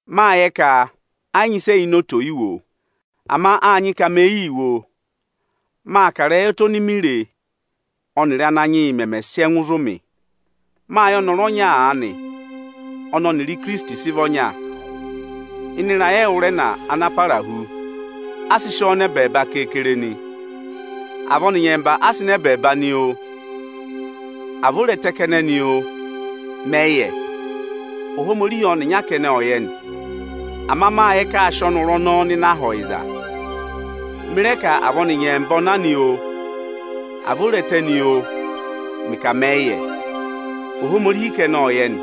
Mâ yẹ ka ẹ yị nyị ịsị ẹ yà ini oto ò yi wo, ama â nyị ka me yii wo o. Maa kà ịrẹyị ẹtẹ oni mi re ọnịrị Ánanyị yị mẹmẹ sị ẹngụ zụ̀ mị. Mâ yẹ ọnọrụ ọnya aanị ọnị ọnịrị Ohinọyị oni Ohomorihi nyị ka ọ̀ dọ yị há sị vị ọnya. Ịnị ịrayị ẹwụrẹna ana parahu, a sị sị ọọ nọ ẹbẹẹba keekere nị. À vị ọnị nyẹmba a sị nọ ẹbẹẹba nị oo, à vị ọ re ẹtẹ kẹnẹ nị oo, mẹ yị yẹ. Ohomorihi ọnịnya kẹnẹ ọ yẹ nị. Ama mâ yẹ ka aa sị ọnọrụ ọnọọ nọ Aha ọyịza. Mị rẹ ka, à vị ọnị nyẹmba ọ na nị oo, à vị o re ẹtẹ nị oo, mẹ yị yẹ; Ohomorihi kẹnẹ ọ yẹ nị.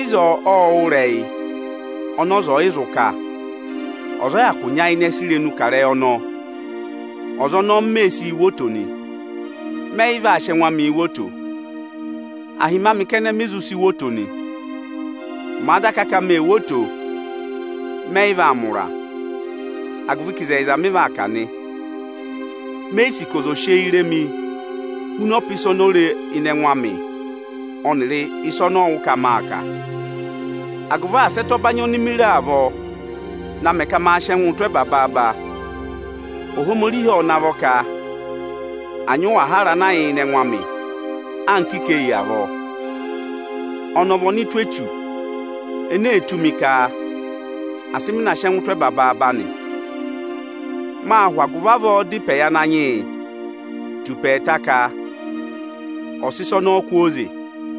Ịzọọ ộ wụ́ ịrẹyị ọnị ọza ẹ̀ yị zụ kà. Ọza ọ yị hyakụ nyayịnẹ sị irenu kà ịrẹyị ọnọọ. Ọza ọnọọ m mee sii wo oto nị, mẹ yị vaa sị ẹngụ amịị wo oto. Ahịmị kẹnẹ mi zụ si wo oto nị. Màa daka ka mee wo oto, mẹ yị vaa mẹ ụra, agụvị ka ịzẹyịza mị vaa kà nị. Me yi sì ka ọza òo si eyii re mị huna ọpa ịsa oni o re ịnị ẹngụ amị ọnịrị ịsị ọnị ọ wụ́ ka maa kà. Agụvị asị ẹtẹ ọbanyị oni mi re avọọ na mẹ ka maa sị ẹngụụ tụ́ ẹba baaba, Ohomorihi ộ navọ ka ma nyị ẹngụkata tụ́ ọchẹngụ amị anka ikeyi avọọ. Ọnị ọ vị ọnụtụ Echu ene ee tụ́ mi ka asị mị sị ẹngụ tụ́ ẹba baaba nị. Mâ hụ agụvị avọọ dá ịpẹ yị Ananyị yị tù ịpẹ ẹẹta ka ọ̀ sị ịsa ọnọọ kwooze mi.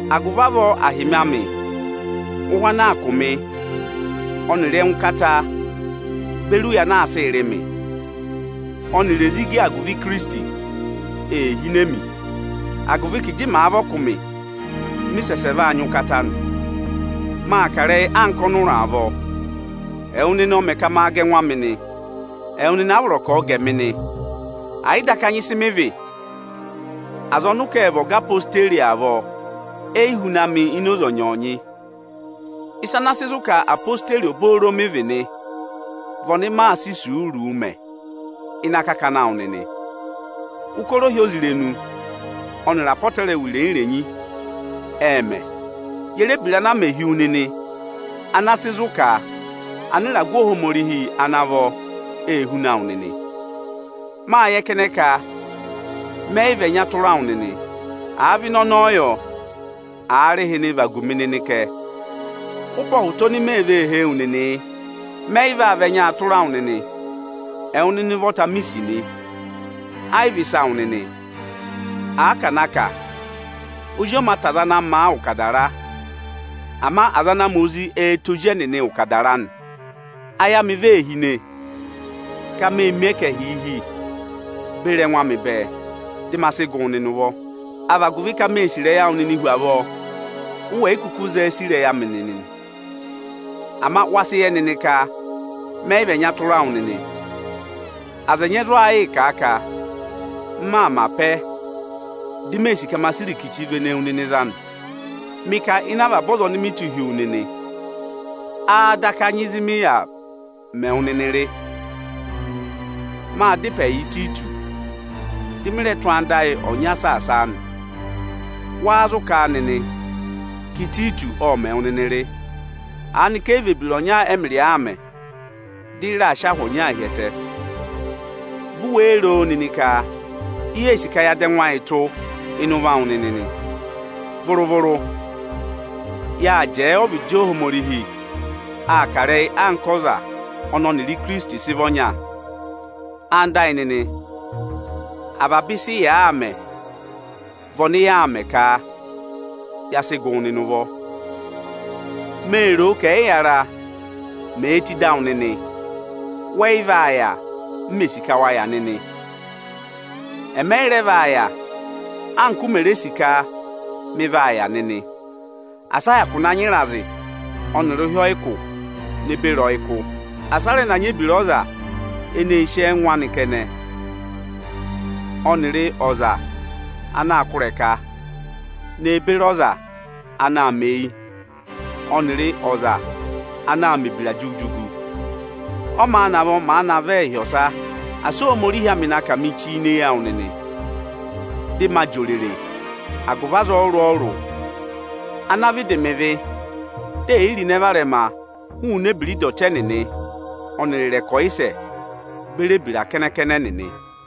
Agụvị avọọ ahịmị amị, ụhụ ana aa kụ̀ mị, ọnịrị ẹngụkata beri ụya ana aa sịị rị mị, ọnịrị ezigi agụvị Ikirisiti, ee hine mi. Agụvị ka ịjị màa vị ọkụmị, ịjọnọọ mị sẹsẹ vaa nyị ụkata nị. Maa kà ịrẹyị anka ọnụra avọọ, ama ẹwụ nịnị ọ mẹ ka ma maanị wo oto, di maa ga ẹngụ amị nị. Ẹwụ nịnị a vọrọ ka ọ̀ọ ga ẹmị nị, ẹ̀ yị daka nyị ịsị mị vị, aza ọnị ụ sị mẹ ọga ezirẹma Ijeesu nịnị avọọ, e yi huna mị ini oze ọnyọọnyị. Ịsa ana sị zụ̀ ka ezirẹma Ijeesu obooro mị vị nị vị ọnị maa sị isuuru mẹ ịnị akakana awụ nịnị: ụkọrọ ohyozirenu ọnịrị apọtẹrẹwa irenyi-irenyi ệ mẹ. Ye re ebira ana a mẹ hi wu nịnị ana sị zụ̀ ka anịragụ Ohomorihi ana vọ ê huna wụ nịnị? Mâ yẹ kẹnẹ ka mẹ yị vị ẹnya tụra awụ nịnị. Àa vị ịnị ọnọọ yọ, aarịhịnị, vagu mi nịnị kẹ! Ụpẹ ọhụta oni mee vee hee wu nịnị yị. Mẹ yị yị vaa vị ẹnyaa tụra wụ nịnị. Ẹwụ nịnị ụvọta mi sì nị, ẹ yị vị ịsa awụ nịnị. Àa ka à na kà, ozi ọ mā tẹ aza ana ma ụkadara, aza ana ma ozi ẹẹ̄ tẹ ozi ụkadara nị. Ayị amị vee hine ka ma hụrị ụvọ avaba ịsị mi nyị neberi ẹngụ amị bẹẹ, dị ma sị gụ wụ nịnị ụvọ. Áá vị agụvị ka mee sì ịrẹyị awụ nịnịị hu avọọ, ụ wẹ̀ yị kụkụ zẹẹ sì ịrẹyị amị nịnịị? Ama wa sị yẹ nịnị ka mẹ yị vị ẹnya tụra wụ nịnị. Aza ẹnyị ẹ zụ aa yịị kà a ka m maa mẹ̀ apẹ, di mee sì ka ma sị ọbọ vene wu nịnị za nị. Mị ka ịnị avaba aza ọnị mị tụ́ hi wu nịnị, áá daka nyị ịzị mị yà mẹ wụ nịnị rị? Mâ dá ịpẹ yị Ịtayịtọsị, dị mị rẹ tụ́ anda ayị ọnya saasa a nị. Wáá zụ kà a ka Ịtayịtọsị ộ mẹ̀ wụ nịnị rị? Aanị ka ẹ yị vị ebira ọnya ẹmịrị ọ aa mẹ, dị ị raa sị ahụ ọnyọọnyaa hi ẹtẹ? Vi u wéé ro nịnị ka i yee sì ka ya dọ ẹngụ ayị tụ́ ịnị ụvọ awụ nịnị nị? Vụrụ-vụrụ. Yâ jẹẹ ọvịdị Ohomorihi aa kà ịrẹyị anka ọza ọnị ọnịrị Ikirisiti sị vị ọnya. Ẹwụ nịnị ẹyịnyara amị, avaba ịsị ị yaa mẹ vị ọnị yaa mẹ ka ya sị gụ wụ nịnị ụvọ. Mee roo ka ẹyịyara, mèe tù ịdị awụ nịnị, wẹ yị vaa yà, anka m mè sì ka wa yà nịnị. Ẹmị ẹ yị rẹ vaa yà anka u mè sì ka ma yà nịnị. Asị a hyakụ na nyị ịrazị ọnịrị ụhị ọyịkụ ne beri ọyịkụ! Asị a rẹ na nyị ebira ọza eneē sì ẹngụ anị kẹnẹ, ọnịrị aza eneē du ọza ịrẹsụ, ọnịrị ọza anaā kụ́ ịrẹka, ne beri ọza anaā mẹ eyi, ọnịrị ọza anaā mẹ̀ ebira jugu-jugu. Ọ́ maa navọ, màa na vẹ ịhị ọsa, asị Ohomorihi amị na kà mi chi ini eyi awụ nịnị. Dị maa jị òrèrè agụvị aza ọrụrụ-ọrụrụ ana vịdị mẹ ịvị dị è yi ro ịnẹ varẹma hụụnị ebira ịdọtị ẹnịnị ọnịrị ịrẹkọyịsẹ beri ebira kẹnẹ-kẹnẹ ẹnịnị.